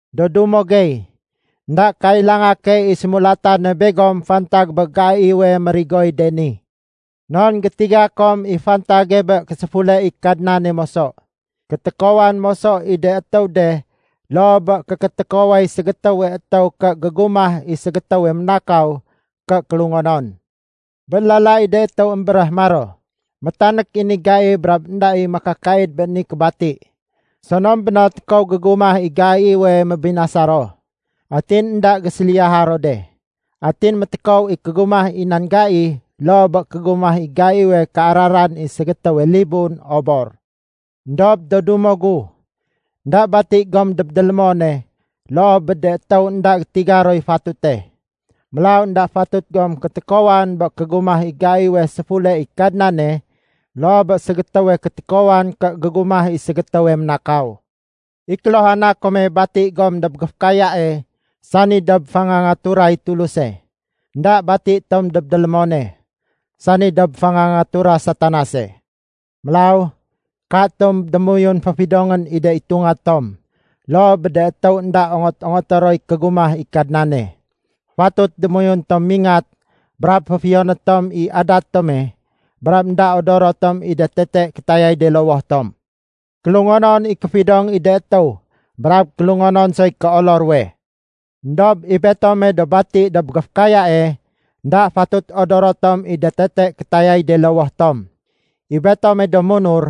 Do dumo gey, énda kailanga key i sémulatane begom fantag bé gaiwe mérigoy de ni. Non gétiga kom i fantage bé késéfule i Kadnane moso. Kétékowan moso i de étéw de loo bé kékétékoway ségétéwe étéw ké gégumah i ségétéwe ménakaw ké kélungonon. Bé lala i de étéw émbéréh maro, “Métanék i ni gai brab énda i makakaid bé ni kébati,” sonom béno tékow gégumah i gaiwe mébinasa ro. Atin énda géséliyaha ro de. Atin métékow i kégumah i nan gai loo bé kégumah i gaiwe kéararan i ségétéwe libun obor. Endob do dumo gu, énda bati gom dob délémone loo bé de étéw énda gétiga roy fatute. Mélaw énda fatut gom kétékowan bé kégumah i gaiwe séfule i Kadnane loo bé ségétéwe kétékowan ké gégumah i ségétéwe ménakaw. I kéluhana kome bati gom dob géfékayae sani dob fangangaturay Tuluse. Enda bati tom dob délémone, sani dob fangangatura Satanase. Mélaw katom démoyun féfidongén i de itunga tom loo bé de étéw énda ongot-ongoté roy kégumah i Kadnane. Fatut démoyun tom mingat brab féfiyoné tom i adat tome brab énda odoro tom i de tete kétayay de lowoh tom. Kélungonon i kéfidong i de étéw brab kélungonon soy kéolo ruwe. Endob i betome do bati dob géfékayae énda fatut odoro tom i de tete kétayay de lowoh tom. I betome do munur,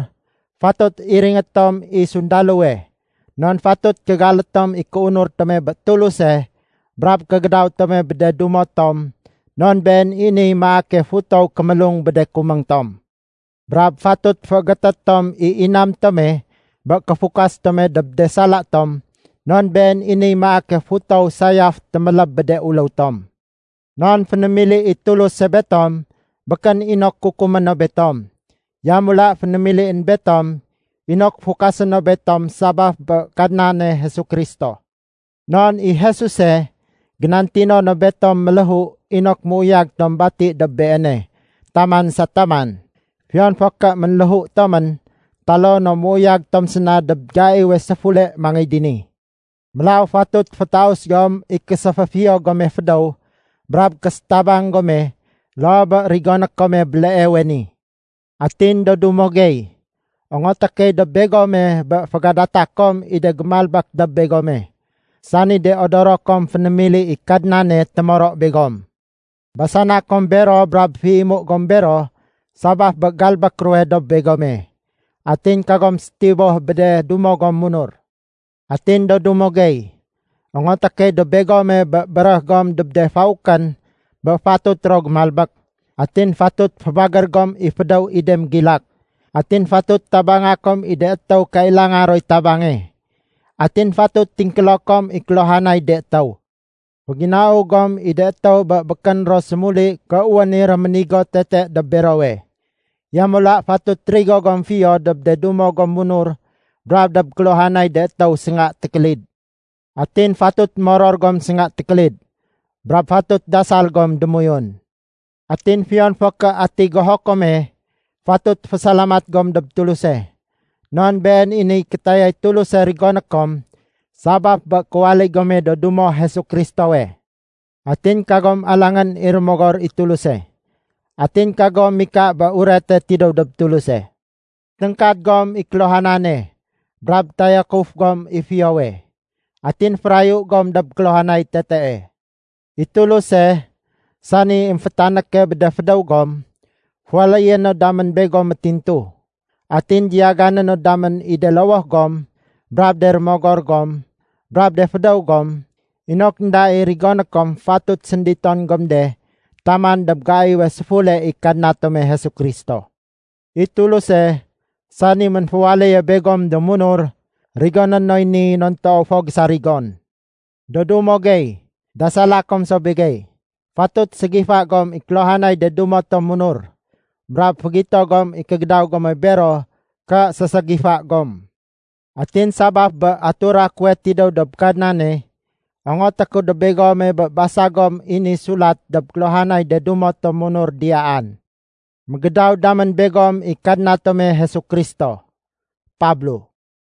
fatut iringé tom i sundalowe, non fatut kégalé tom i kéunur tome bé Tuluse brab kégédaw tome bé de dumo tom non been i niy maake futow kémélung bé de kuméng tom. Brab fatut féégété tom i inam tome bé kéfukas tome dob de sala tom non been i niy maake futow sayaf téméléb bé de uléw tom. Non fénémili i Tuluse betom békén inok kukumé no betom. Yamula fénémilién betom inok fukasé no betom sabaf bé Kadnane Jesu Kristo. Non i Jesuse génantino no betom méléhu inok méuyag tom bati dob beene taman sa taman fiyon fo ké ménléhu tomén taloo no méuyag tom séna dob gaiwe séfule mangéy dini. Mélaw fatut fétaus gom i késéféfiyo gome fédéw brab késétabang gome loo bé rigoné kome béleewe ni. Atin do dumo gey, ongoté key dob begome bé fégadata kom i de gémalbék dob begome, sani de odoro kom fénémili i Kadnane témoro begom. Basana kom bero brab féimu gom bero sabaf bé galbék ruwe dob begome. Atin kagom sétiboh bé de dumo gom munur. Atin do dumo gey, ongoté key dob begome bé béréh gom dob de faukén bé fatut ro gémalbék. Atin fatut fébagér gom i fédéw i de mégilak. Atin fatut tabanga kom i de étéw kailanga roy tabange. Atin fatut tingkélo kom i kéluhanay de étéw. Féginau gom i de étéw bé békén ro sémuli ké wén i réménigo tete dob berowe. Yamula fatut rigo gom fiyo dob de dumo gom munur brab dob kéluhanay de étéw sénga tékélid. Atin fatut moror gom sénga tékélid. Brab fatut dasal gom démoyun. Atin fiyon fo ké ati goho kome, fatut fésalamat gom dob Tuluse. Non been i niy kétayay Tuluse rigoné kom sabaf bé kéwaléy gome do dumo Jesu Kristowe. Atin kagom alangén i Rémogor i Tuluse. Atin kagom mika bé urete tidéw dob Tuluse. Téngkad gom i kéluhanane brab tayakuf gom i fiyowe. Atin férayu gom dob kéluhanay tetee. I Tuluse, sani émfétanéke bé de fédéw gom, féwaléyé no damén begom métintu. Atin diyagané no damén i de lowoh gom brab de rémogor gom brab de fédéw gom inok énda i rigoné kom fatut sénditon gom de taman dob gaiwe séfule i Kadna tome Jesu Kristo. I Tuluse, sani ménféwaléye begom do munur, rigoné noy ni non toow fo gésarigon. Do dumo gey, dasala kom so begey. Fatut ségifa gom i kéluhanay de dumo tom munur, brab fégito gom i kégédaw gome bero ké séségifa gom. Atin sabaf bé atura kuwe tidéw dob Kadnane, ongoté ku dob begome bé basa gom i ni sulat dob kéluhanay de dumo tom munur diyaan. Mégédaw damén begom i Kadna tome Jesu Kristo. Pablo